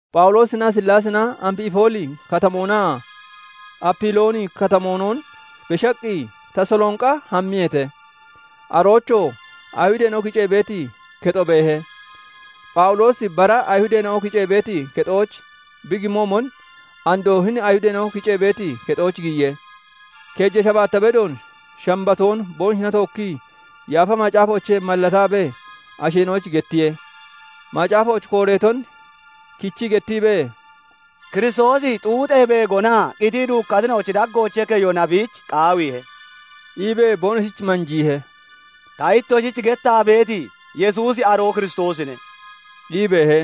Phawuloosinaa Sillaasina Amfipooli Katamoonaa Apilooni Katamoonon beshaqqi, Tasaloonqa hammiyeete; aroochoo Ayihudeena'o kicee beeti kexo beehe. Phawuloosi bara Ayihudeena'o kicee beeti kexooch bi gimoomon, andoo hini Ayihudeena'o kiceeti kexooch giyiye. Keeja shabaatta bedoon Shambatoon boonoshina tookkii Yaafa Macaafoochee mallataabee asheena'oyich gettiye. Macaafooch kooreeton kichii gettiibee, "Kiristoosi xuuxee beegonaa qitii duukkatina'ochi daggoochee keyona biich qaawiihe" iibee boonoshich manjiihe. "Ta ittoshich gettaa beeti Yesuusi aroo Kiristoosine" ii beehe.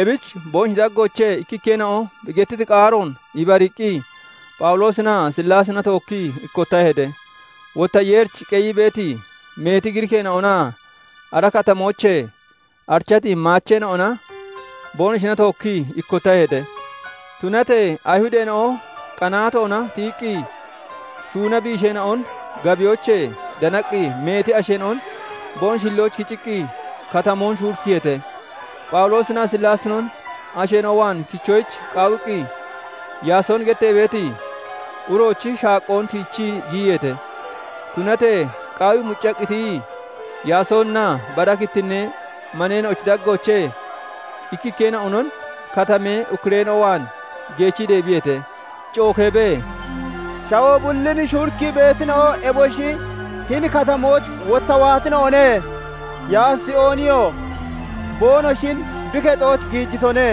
Ebich boonoshi daggoochee ikkikkeena'o bi gettiti qaaroon ibariiqqi Phawuloosinaa Sillaasina tookkii ikkottaheete; wotta Yeerich qeyii beeti, meeti Giriikeena'onaa ara katamoochee arichati maacheena'ona boonoshina tookkii ikkottaheete. Tunatee Ayihudeena'o qanaatoona tiyiqqi, shuuna biisheena'on gabiyoochee danaqqi, meeti asheena'on boonoshi hillooch kiciqqi, katamoon shuurikkiyeete; Phawuloosinaa Sillaasinon asheena'o waan kichoyich qaawiqqi, Yaasooni gettee beeti uroochi shaaqqoon tiichii giyiyeete; tunatee qaawii muccaqqi tiyii, Yaasooninaa bara kittinnee maneena'ochi daggoochee ikkikkeena'onon katamee ukkureena'o waan geechii deebiyeete; cookeebee, "Shawoo bullin shuurikkii beetina'o eboshi hini katamooch wotta waatina'one; Yaasooniyoo boonoshin bi kexooch giijitone;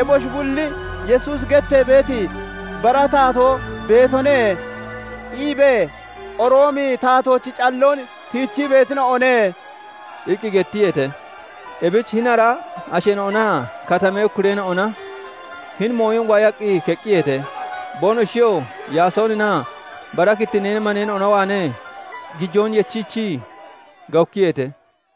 eboshi bulli 'Yesuusi gettee beeti bara taatoo beetone' iibee Roomi taatoochi calloon tiichii beetina'one" iqqi gettiyeete. Ebich hini ara asheena'onaa katamee ukkureena'ona hini mooyon waayaqqi keqqiyeete. Boonoshiyoo Yaasooninaa bara kittinnee maneena'ona waanee gijoon yechiichii gawukkiyeete.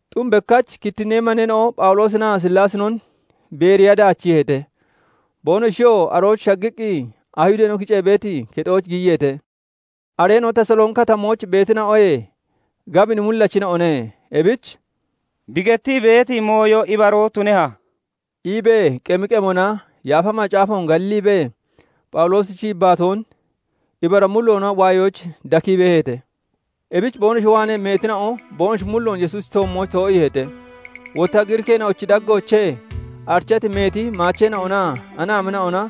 Xum bekkach kittinnee maneena'o Phawuloosinaa Sillaasinon Beeriya daachiiheete. Boonoshiyoo arooch shaggiqqi, Ayihudeena'o kicee beeti kexooch giyiyeete. Areena'o Tasaloonqi Katamooch beetina'oyee gabini mullachina'one; ebich "Bi gettii beeti mooyo ibaroo tuneha?" iibee qemi qemona Yaafa Macaafoon galliibee, Phawuloosichi yibbaatoon ibara mulloona waayoyich dakii beeheete. Ebich boonoshi waanee meetina'o boonoshi mulloon Yesuusichi toommooch too'iiheete; wotta Giriikeena'ochi daggoochee arichati meeti maacheena'onaa anaamina'ona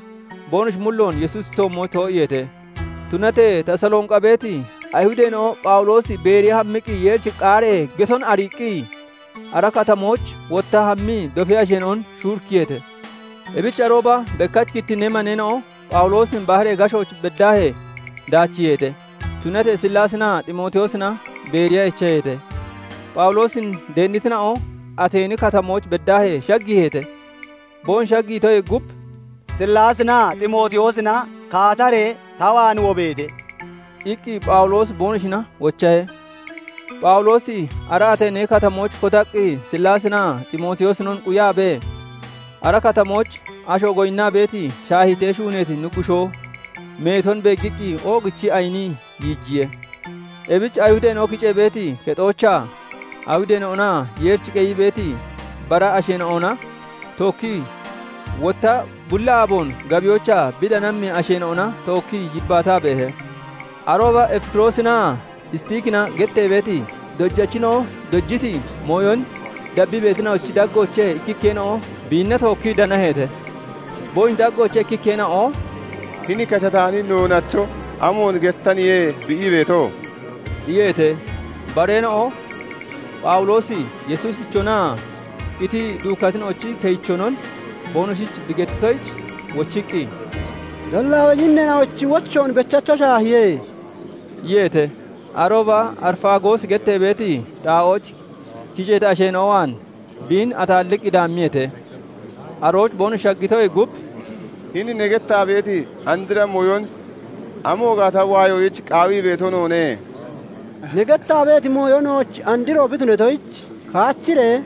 boonoshi mulloon Yesuusichi toommooch too'iiheete. Tunatee Tasaloonqa beeti Ayihudeena'o Phawuloosi Beeriya hammiqqi Yeerichi qaaree geton ariiqqi, ara katamooch wotta hammii dofee asheena'on shuurikkiyeete. Ebich arooba bekkach kittinnee maneena'o Phawuloosin baharee gashooch beddaahee daachiiheete; tunatee Sillaasinaa Ximootiyoosina Beeriya echaheete. Phawuloosin deennitina'o Ateeni Katamooch beddaahee shaggiiheete. Boonoshi shaggiitoyee gub, "Sillaasinaa Ximootiyoosina kaataree ta waan wobeete!" iqqi Phawuloosi boonoshina wochahe. Phawuloosi ara Ateeni Katamooch kotaqqi Sillaasinaa Ximootiyoosinon quyaabee, ara katamooch asho goyinnaa beeti shaahiitee shuuneeti nuggushoo meeton beeggiqqi, oogichii ayinii yiijiye. Ebich Ayihudeena'o kicee beeti kexoochaa Ayihudeena'onaa Yeerichi qeyii beeti bara asheena'ona tookkii, wotta bulli aaboon gabiyoochaa bi danammi asheena'ona tookkii yibbaataa beehe. Arooba Efikiroosinaa Istiikina gettee beeti dojachina'o dojiti mooyon dabbii beetina'ochi daggoochee ikkikkeena'o biinna tookkii danaheete. Boonoshi daggoochee ikkikkeena'o "Hini kashataani noonacho amoon gettaniye bi ii beeto?" iyeete. Bareena'o, Phawuloosi Yesuusichonaa qitii duukkatina'ochi keyichonon boonoshich bi gettitoyich, wochiqqi, "Dallaawa yinneena'ochi wochoon bechacho shaahiye" iyeete. Arooba Arifaagoosi gettee beeti xaa'ooch kiceeti asheena'o waan biin ataalliqqi daammiyeete. Arooch boonoshi shaggitoyee gub, "Hini ne gettaa beeti andra mooyon amo gaata waayoyich qaawii beeto noone. Ne gettaa beeti mooyo nooch andro bi tunatoyich, kaachiree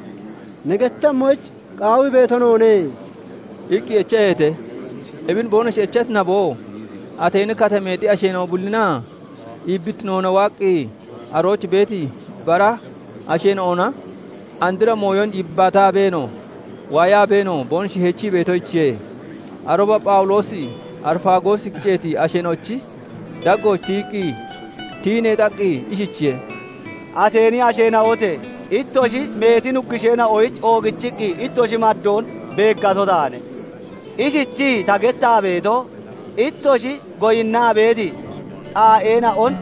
ne gettemmoyich qaawii beeto noone" iqqi echaheete. Ebin boonoshi echati naboo Ateeni katameexi asheena'o bullinaa iibbittinoona waaqqi arooch beeti bara asheena'ona andra mooyon yibbaataabeenoo, waayaabeenoo boonoshi heechii beetoyichiye. Arooba Phawuloosi Arifaagoos kiceeti asheena'ochi daggooch tiyii neexaqqi ishichiye:- "Ateeni asheena'ote! Ittoshi meeti nuggusheena'oyich oogichiqqi ittoshi maddoon beeggato taane. Ishichii ta gettaa beeto, ittoshi goyinnaa beeti xaa'eena'on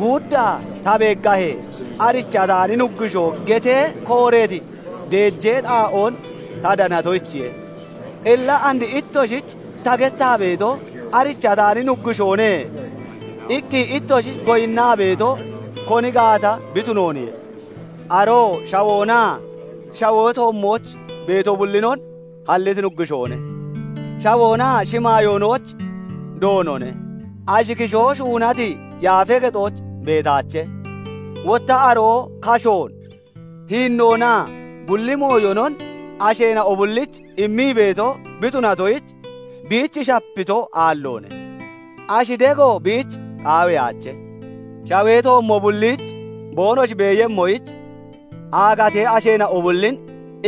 guuddaa ta beeggahee, 'Arichataani nuggushoo' getee kooreeti deejee xaa'oon ta danatoyichiye. Illa and ittoshich ta gettaa beeto, 'Arichataani nuggushoone' iqqi ittoshi goyinnaa beeto, koni gaata bi tunooniye. "Aroo shawoonaa shawee toommooch beeto bullinon halliti Nuggushoone; shawoonaa shimaayoonochi Doonone; ashi kishoo shuunati yaafee kexooch beetaache. Wotta aroo kashoon, hiinnoonaa bulli mooyonon asheena'o bullich immii beeto bi tunatoyich, biich shapito aalloone; ashi dego biich qaawiyaache. Shawee toommo bulliich boonoshi beeyemmoyich, aagatee asheena'o bullin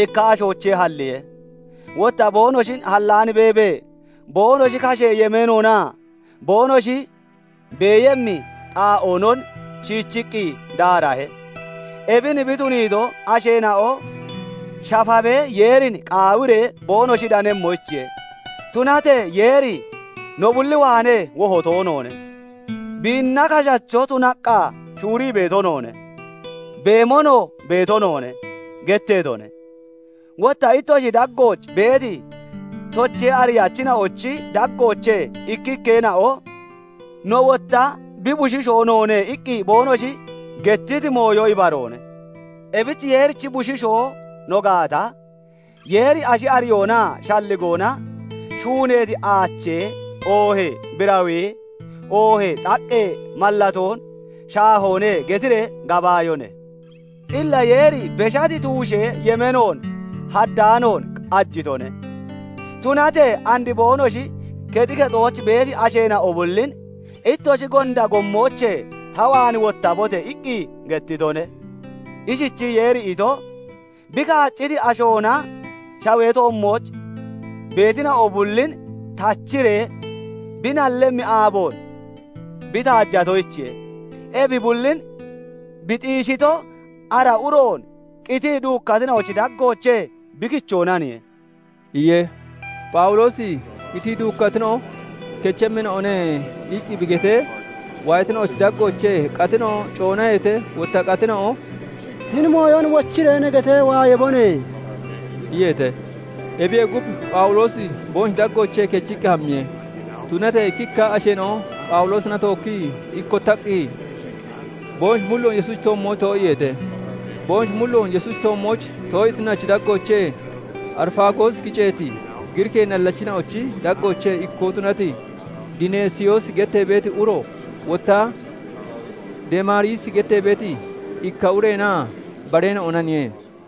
ikka ashoochee halliye. Wotta boonoshin hallaan beebee, boonoshi kashee yemeenoonaa boonoshi beeyemmi xaa'oonon shiichiqqi daarahe. Ebin bi tuniito, asheena'o shafabee Yeerin qaawiree, boonoshi danemmoyichiye. Tunatee Yeeri no bulli waanee woho toonoone. 'Biinna kashacho tunaqqa shuurii beeto noone; beemonoo beeto noone' getteetone. Wotta ittoshi daggooch beeti tochee ariyachina'ochi daggoochee ikkikkeena'o 'No wotta bi bushiishoo noone' iqqi boonoshi gettiti mooyo ibaroone. "Ebich Yeerichi Bushiishoo no gaata, 'Yeeri ashi ariyoonaa shalligoona shuuneeti aachee, oohee birawee, oohee xaqqee mallatoon shaahoone' getiree gabaayone. Illa Yeeri beshati tuushee yemeenoon haddaanoon qajitone; tunatee and boonoshi kexi kexooch beeti asheena'o bullin 'Ittoshi gonda gommoochee ta waan wottabote!' iqqi gettitone. Ishichii Yeeri ito, bi kaacciti ashoona shawee toommooch beetina'o bullin tachiree bi nallemmi aaboon bi taajatoyichiye. Ebi bullin bi xiishito, ara uroon qitii duukkatina'ochi daggoochee bi kichoonaniye" iye. Phawuloosi "Qitii duukkatina'o kechemmina'o ne" iqqi bi getee, waayatina'ochi daggoochee qatina'o coonaheete; wotta qatina'o "Hini mooyon wochiree ne getee waayabone!" iyeete. Ebiyee gub, Phawuloosi boonoshi daggoochee kechiqqi hammiye. Tunatee ikkikka asheena'o Phawuloosina tookkii ikkottaqqi, boonoshi mulloon Yesuusichi toommooch too'iiheete. Boonoshi mulloon Yesuusichi toommooch too'iitina'ochi daggoochee Arifaagoos kiceeti Giriikee nallachina'ochi daggoochee ikkoo tunati Dineesiyoosi gettee beeti uro, wotta Demaariisi gettee beeti ikka ureenaa bareena'onaniye.